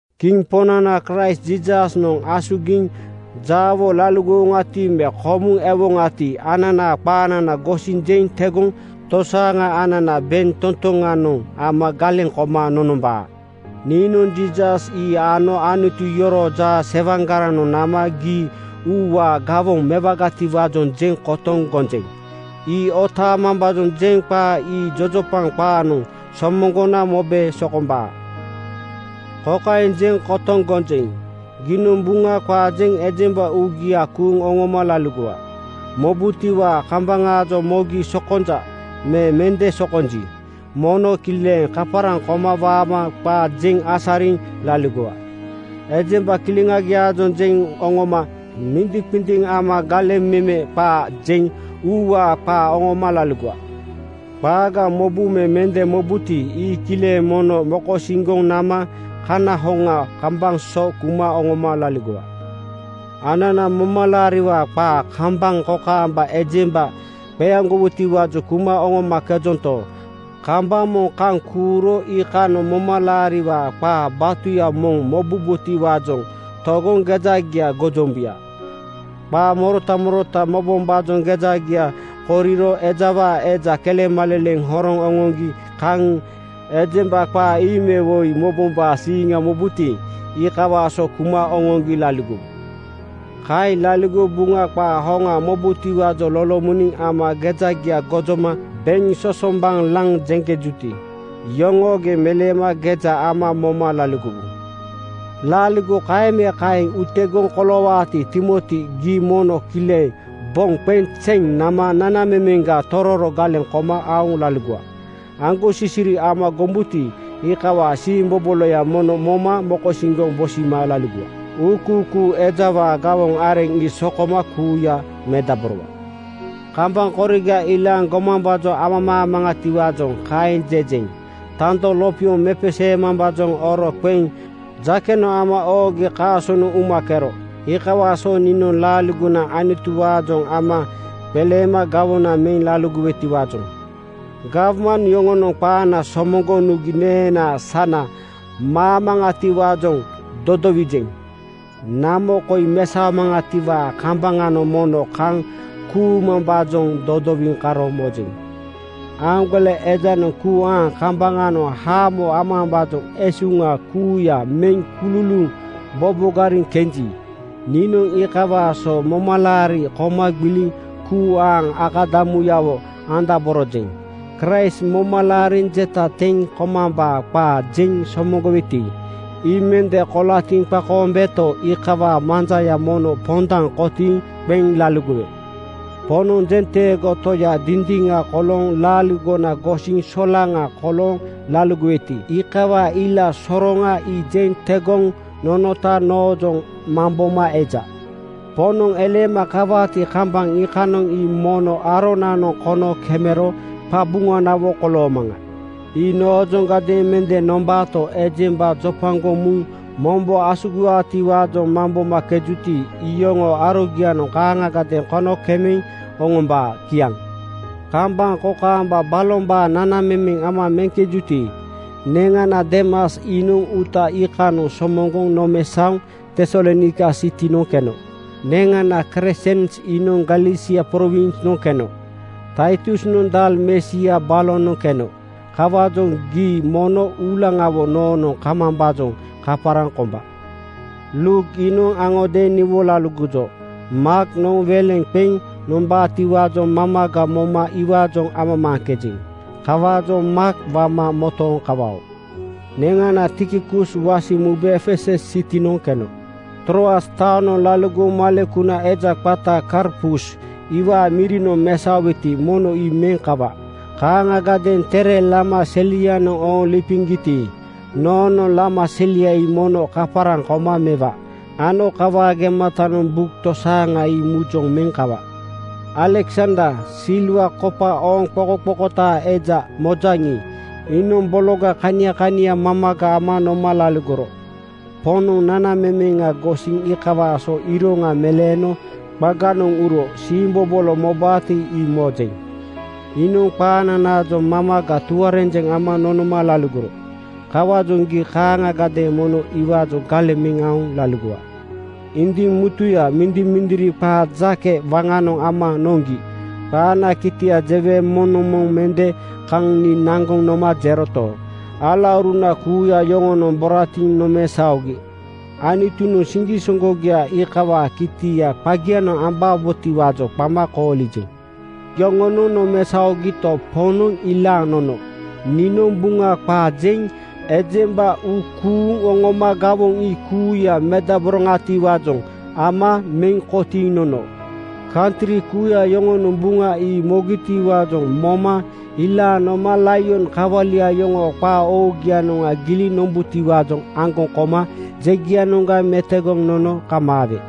Kiŋ Poŋnana Kraist Jiisasnoŋ asugiŋ jaawo laligowoŋati, me komuŋ ewoŋati ananaa qaanana gosiŋ jeŋ tegoŋ tosaaŋa anana bentotoŋanoŋ ama galeŋ koma nonombaa. Niinoŋ Jiisas ii ano Anutu yoroo jaasewaŋgaranoŋ nama gii uuwaa gawoŋ mewagatiwaajoŋ jeŋ kotoŋ gonjeŋ. Ii otaamambaajoŋ jeŋ qaa ii jojopaŋ qaanoŋ somoŋgona mobe sokombaa. Kokaeŋ jeŋ kotoŋ gonjeŋ: Giinoŋ Buŋa qaa jeŋ ejemba uugia kuuŋ oŋoma laligowa. Mobutiwaa kambaŋaajoŋ mogi sokonja me mende sokonji, mono kileŋ kaparaŋ koma waama qaa jeŋ asariŋ laligowa. Ejemba kileŋagiaajoŋ jeŋ oŋoma mindiŋqindiŋ ama galeŋ meme qaa jeŋ uuwaa qaa oŋoma laligowa. Qaaga mobu me mende mobuti, ii kileŋ mono mokosiŋgoŋ nama kana hoŋa kambaŋ so kuma oŋoma laligowa. Anana momalaariwaa qaa kambaŋ kokaamba ejemba qeaŋgowutiwaajoŋ kuma oŋomakejonto, kambaŋ moŋ kaŋ kuuro iikanoŋ momalaariwaa qaa batuya moŋ mobubotiwaajoŋ togoŋ gejagia gojombuya. Qaa morota morota mobombaajoŋ gejagia koriro ejawaa eja kelemaleleŋ horoŋ oŋoŋgi kaŋ ejemba qaa ii me woi mobombaa siiŋa mobuti, iikawaa so kuma oŋoŋgi laligowu. Kaeŋ laligoŋ Buŋa qaa hoŋa mobubotiwaajoŋ lolomoniŋ ama gejagia gojoma beŋ sosombaŋ laŋ jeŋkejuti, iyoŋoogeŋ meleema geja ama moma laligowu. Laaligo kaeŋ me kaeŋ utegoŋ koloowaati, Timoti gii mono kileŋ boŋ qeŋ zeŋ nama nanamemeŋga tororo galeŋ koma aoŋ laligowa. Aŋgosisiri ama gombuti, iikawaa siimboboloya mono moma mokosiŋgoŋ bosima laligowa. Uukuukuu (ewanjelis) ejawaa gawoŋ areŋ ii sokoma kuuya medaborowa. Kambaŋ koriga ilaaŋ gomambaajoŋ amamaamaŋatiwaajoŋ kaeŋ jejeŋ. Tando lopioŋ mepeseewombaajoŋ oro qeŋ jakenoŋ ama oogi kaasonoŋ umakero. Iikawaa so niinoŋ laaligona Anutuwaajoŋ ama qeleema gawoŋa meŋ laligowetiwaajoŋ gawman yoŋonoŋ qaana somoŋgoŋ nugi neenaa sana maamaŋatiwaajoŋ dodowijeŋ. Namo koi mesaomaŋatiwaa kambaŋanoŋ mono kaŋ kuumambaajoŋ dodowiŋ karo mojeŋ. Aaŋgole ejanoŋ kuu aaŋ kambaŋanoŋ haamo amambaajoŋ esuŋa kuuya meŋ kululuuŋ bobogariŋ kenji, niinoŋ iikawaa so momalaari koma gbiliŋ kuu aaŋ akadamuyawo andaborojeŋ. Kraist moma laariŋ jeta teŋ komambaa qaa jeŋ somoŋgoweti ii mende kolatiŋ qakoombeto, iikawaa manjaya mono pondaŋ kotiiŋ qeŋ laligowe. Poŋnoŋ jenteego Toya dindiŋa kolooŋ laaligona gosiŋ solaŋa kolooŋ laligoweti, iikawaa ila soroŋa ii jeŋ tegoŋ nonota noojoŋ mamboma eja. Poŋnoŋ eleema kawaati kambaŋ iikanoŋ ii noma aronanoŋ kono kemero qabuŋanawo koloomaŋa. Ii noojoŋadeeŋ mende nombaato, ejemba jopagoŋ muŋ mombo asugiwaatiwaajoŋ mambomakejuti, ii iyoŋoo arogianoŋ kaaŋagadeeŋ kono kemeŋ oŋombaa. Kiaŋ. Kambaŋ kokaamba balombaa nanamemeŋ ama meŋkejuti, neŋana Deemas iinoŋ uuta iikanoŋ somoŋgoŋ nomesaoŋ Tesalonaika sitinoŋ keno. Neŋana Kresens iinoŋ Galesia prowinsnoŋ keno. Taitusnoŋ Dalmesia balonoŋ keno. Kawaajoŋ gii mono uulaŋawo noonoŋ kamambaajoŋ kaparaŋ komba. Luuk iinoŋ aŋodeeŋ niwo laligojo. Maaknoŋ weleŋ qeŋ nombaatiwaajoŋ mamaga moma iwaajoŋ amamaajeŋ. Kawaajoŋ Maak wama motooŋ kawao. Neŋana Tikikus wasiŋ mube Efesus sitinoŋ keno. Troas taonoŋ laligoŋ malekuna eja qata Karpus iwaa mirinoŋ mesaoweti, mono ii meŋ kawa. Kaaŋagadeeŋ tere lama selianoŋ ooŋ lipiŋgiti, noonoŋ lama selia ii mono kaparaŋ koma mewa ano kawaa gematanoŋ buk tosaaŋa ii mujoŋ meŋ kawa. Aleksander, silwa kopa ooŋ qokoqokotaa eja mojaŋi, iinoŋ bologa kania kania mamaga ama noma laligoro. Poŋnoŋ nanamemeŋa gosiŋ iikawaa so iroŋa meleeno qaganoŋ uro siimbobolo mobaati ii mojeŋ. Iinoŋ qaananaajoŋ mamaga tuarenjeŋ ama nonoma laligoro. Kawaajoŋ gii kaaŋagadeeŋ mono iwaajoŋ galeŋ meŋ aoŋ laligowa. Indiŋ mutuya mindimindiri qaa jake waŋanoŋ ama noŋgi qaana kitia jewe moŋnoŋ moŋ mende kaŋ nii naŋgoŋ noma jeroto, alauruna kuuya yoŋonoŋ boratiŋ nomesaogi. Anutunoŋ siŋgisoŋgogia iikawaa kitia qagianoŋ ambabotiwaajoŋ qama koolijeŋ. Yoŋonoŋ nomesaogito, Poŋnoŋ ilaaŋ nono. Niinoŋ Buŋa qaa jeŋ ejemba uu kuuŋ oŋoma gawoŋ ii kuuya medaboroŋatiwaajoŋ ama meŋ kotiiŋ nono. Kantri kuuya yoŋonoŋ Buŋa ii mobutiwaajoŋ moma ilaaŋ noma laion kawalia yoŋoo qaa oogianoŋ giliŋ nombubotiwaajoŋ aŋgoŋ koma jegianoŋga metogoŋ nono kamaawe.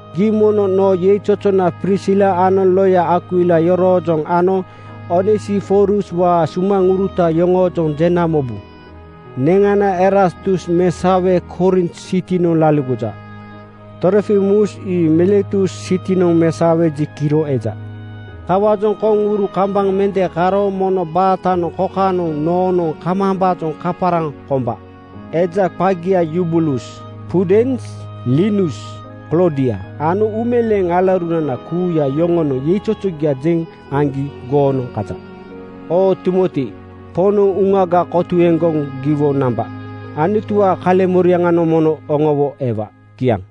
Gii mono noo yeizozona Prisila ano loya Akwila yoroojoŋ ano Onesiforuswaa sumaŋuruta yoŋoojoŋ jena mobu. Neŋana Erastus mesaowe Korint sitinoŋ laligoja. Trofimus ii Miletus sitinoŋ mesaowe ji kiro eja. Kawaajoŋ koŋuru kambaŋ mende karo mono baatanoŋ kokanoŋ noonoŋ kamambaajoŋ kaparaŋ komba. Eja qagia Yubulus, Pudens, Linus, Kloodia ano uumeleeŋ alaurunana kuuya yoŋonoŋ yeizozogia jeŋ aŋgi goonoŋ kaja. Oo Timoti, Poŋnoŋ uŋaga kotuegoŋ giwo namba. Anutuwaa kaleŋmoriaŋanoŋ mono oŋowo ewa. Kiaŋ.